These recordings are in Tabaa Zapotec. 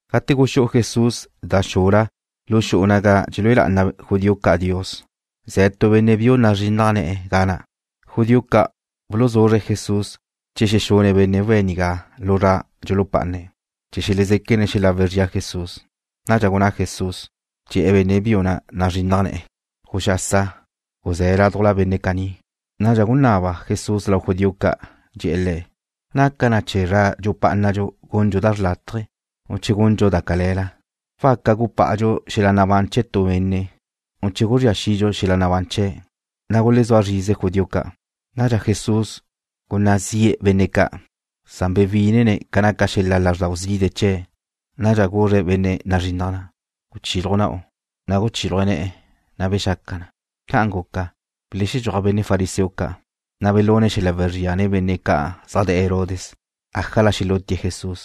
Gate guxú'u Jesús da xula lu xu'u naga dxelúe lá'ana judío ca' Dios, ze̱ tu benne' biu nazrinnaj ne̱'e̱ ga na'. Judío ca' buluzuzre̱' Jesús che xexune̱' benne' we̱' nigá lu zra dxulupá'ane̱', chee̱ xelezéquene̱' xelagu zria Jesús. Nadxa gunná Jesús, dxe̱'e̱ benne' biu na' nazrinnaj ne̱'e̱: ―Guxasa. Guzé̱ laduj benne' caní. Nadxa gunaba Jesús lau judío ca', dxe̱'e̱ le̱': ―¿Naca chee̱ zra dxupá'anadxu gundxu da xrlátaje, u che gundxu da cale̱la? ¿Waca gupá'adxu xel-la nabán chee̱ nu benne', u che guzría xidxu xel-la nabán chee̱'? Na' gulezúa zrize judío ca'. Nadxa Jesús gunná zi'e̱ benne' ca'. Bewí'inene̱' ca naca xel-la lázrdau zide' chee̱'. Nadxa guzre̱' benne' nazrinnaj ne̱'e̱: ―Guchiluj na'u. Guchiluj ne̱'e̱, na' bexaca na. Ca'an guca, belexedxúaj benne' fariseo ca', na' belune̱' xel-la wezría nen benne' ca' zaj de̱'e̱ Herodes ájala xelútie̱' Jesús.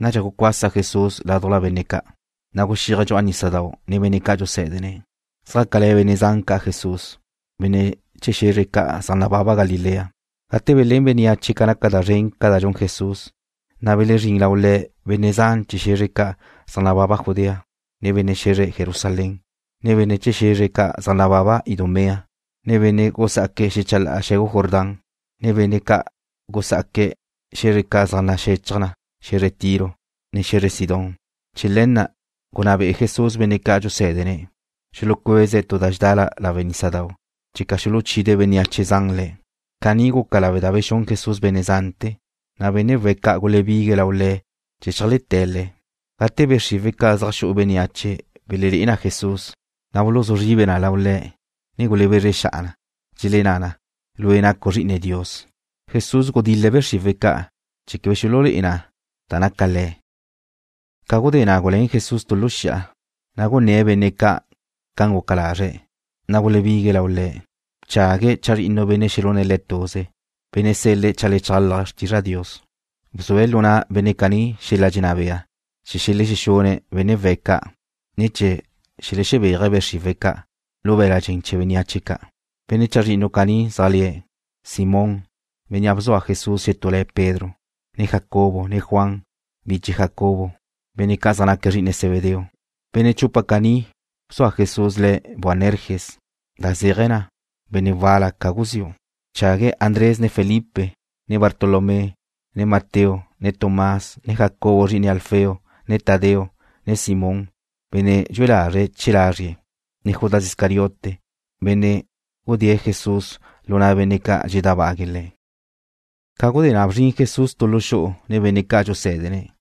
Nadxa gucuasa Jesús laduj benne' ca', na' guxíaje̱' dxu'a nísadau' nen benne' ca' dxusé̱dene̱'. Zjácale̱ benne' zan ca' Jesús, benne' chee̱ xe̱zre ca' zaj nababa Galilea. Gate belén bénneache ca naca da zren ca' da dxun Jesús, belezrín benne' zan lau Le̱', benne' chee̱ xe̱zre ca' zaj nababa Judea, ne benne' xe̱zre Jerusalén, ne benne' chee̱ xe̱zre ca' zaj nababa Idumea, ne benne' gusá'aque̱' xechalá'a xe̱gu Jordán, ne benne' gusá'aque̱' xe̱zre ca' zaj naxechaj na xe̱zre Tiro, ne xe̱zre Sidón. Chee̱ le̱ na' gunná be'e Jesús benne' ca' dxusé̱dene̱' xulucueze̱' tu da dxedá lawe' nísadau' checa xuluchide' bénneache zan Le̱'. Caní guca lawe' da bexún Jesús benne' zante̱, na' benne' we̱' ca' gulebigue̱' lau le̱' chee̱ cheajleté̱' Le̱'. Gate be' xriwe̱' ca' zaj xu'u bénneache belelé'e na Jesús, na' buluzú zribe na lau Le̱', ne gulebezre xa'a na. Dxelenná na: ―Lue' nacu' Zri'ine Dios. Jesús gudil-le̱' be' xriwe̱' ca' chee̱ quebe xululé'e na da naca Le̱'. Ca gudé na' guluén Jesús tu lu xi'a, na' gunné̱' benne' ca' guca lazre̱'. Na' gulebigue̱' lau Le̱'. Bchague̱' chazrinnu benne' xelune̱' Le̱' tuze, benne' sel-le̱' cheajlechálaje̱' xrtizra Dios. Bzue̱' lu na' benne' caní xel-la dxenná bea chee̱ xelexexune̱' benne' we̱' ca', ne chee̱ xelexebéaje̱' be' xriwe̱' ca' lu be̱l-la' dxen chee̱ bénneache ca'. Benne' chazrinnu caní zaj le̱': Simón, bénnea' bzua Jesús xetú le̱' Pedro, ne Jacobo ne Juan, biche Jacobo, benne' ca' zaj naque̱' zri'ine Zebedeo. (Benne' chupa caní bzua Jesús le̱' Boanerges, da zéaje̱ na benne' wal-la ca guziu'.) Bchague̱' Andrés ne Felipe, ne Bartolomé, ne Mateo, ne Tomás, ne Jacobo zri'ine Alfeo, ne Tadeo, ne Simón, benne' dxue lázrele̱'e̱ chee̱ lazrie̱', ne Judas Iscariote, bénnea' xudée̱' Jesús lu na' benne' ca' dxeledábague̱' Le̱'. Ca gudé na' bzrin Jesús tu lu xu'u nen benne' ca' dxusé̱dene̱'.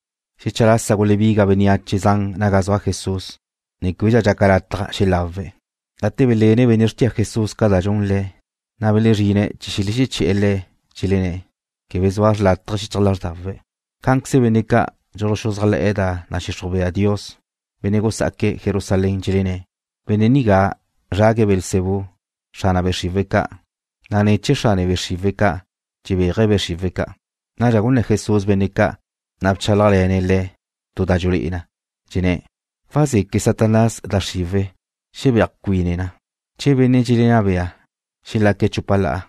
Xecha lasa gulebiga bénneache zan naga zua Jesús, na' québedxa dxaca lataj xelawe̱'. Gate belene benne' xrtia Jesús ca da dxun Le̱', na' belezrine̱' chee̱ xelexeché̱'e̱ le̱'. Dxelenné̱': ―Quebe zua xrlátaje xichaj lázrdawe̱'. Cá'anqueze benne' ca' dxuluxuzájle̱'e̱ da nadxixruj bea Dios, benne' gusá'aque̱' Jerusalén, dxelenné': ―Benne' nigá zrague̱' Beelzebú, xrane be' xriwe̱' ca', na' ne̱ chee̱ xrane be' xriwe̱' ca' dxebéaje̱' be' xriwe̱' ca'. Nadxa gunné̱ Jesús benne' ca', na' bchálajle̱ne̱' le̱' tu da dxulé'e na. Dxenné̱': ―¿Wazeque Satanás da xriwe̱' xebéaj cuine na? Che benne' dxelenná bea xelexaque̱' chupa la'a,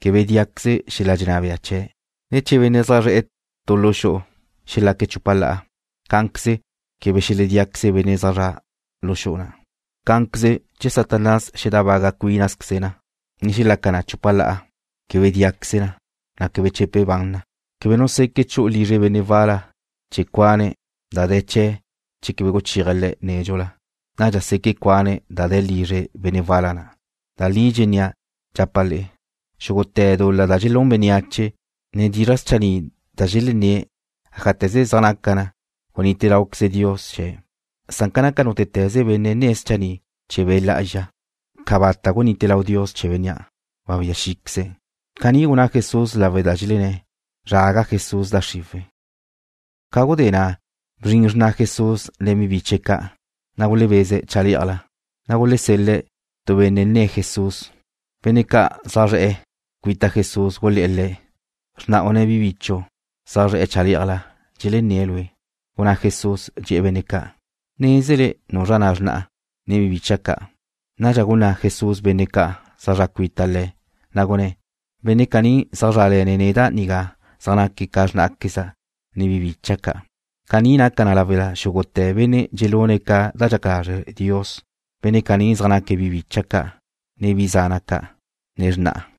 quebe díaqueze xel-la dxenná bea chee̱'. Cá'anqueze che benne' zaj zre̱'e̱ tu lu xu'u xelaque̱' chupa la'a, quebe xeledíaqueze benne' zaj zre̱'e̱ lu xu'u na'. Cá'anqueze, che Satanás tábaga cuínaqueze na, ne xexaca na chupa la'a, quebe díaqueze na. Wadéqueze chee̱ na. ’Quebe nu seque chu'u lizre benne' wal-la chee̱ cuane̱' da de̱ chee̱' che quebe guchéaje̱' le̱' nédxula. Nadxa seque̱' cuane̱' da de̱ lizre benne' wal-la na'. ’Da li dxennía', dxapa' le'e: Xúgute̱ dul-la da dxelún bénneache, ne dizra' schanni' da dxelenné̱', ájate̱ze zaj naca na, gunite láuqueze Dios chee̱'. Na'a, ca naca nútete̱ze benne' nne̱' schanni' chee̱ Be' Lá'azxa, cabata' gunite lau Dios chee̱ bénnea'. Webía xí'queze̱'. Caní gunná Jesús lawe' da dxelenné̱': ―Zraga Jesús da xriwe̱'. Ca gudé na' bzrin xrna Jesús nen bi biche̱' ca'. Gulebeze̱' chalé'ajla, na' gulesel-le̱' tu benne' nne̱' Jesús. Benne' ca' zaj zre̱'e̱ cuita Jesús gulé̱'e̱ le̱': ―Xrna'u ne bi bichu' ca' zaj ze̱' chalé'ajla, dxelenné̱' Lue'. Gunná Jesús, dxe̱'e̱ benne' ca': ―¿Nézele nuzra na' xrna'a, ne bi bicha' ca'? Nadxa gunná' Jesús benne' ca' zaj zre̱'e̱ cuita Le̱', na' gunné̱': ―Benne' caní zaj zrále̱ne̱' neda' nigá zaj naque̱' ca xrnáqueza', ne bi bicha' ca'. Caní naca na lawe' da xúgute̱ benne' dxelune̱' ca da dxaca lazre' Dios, benne' caní zaj naque̱' bi bicha' ca', ne bi zana' ca', ne xrna'a.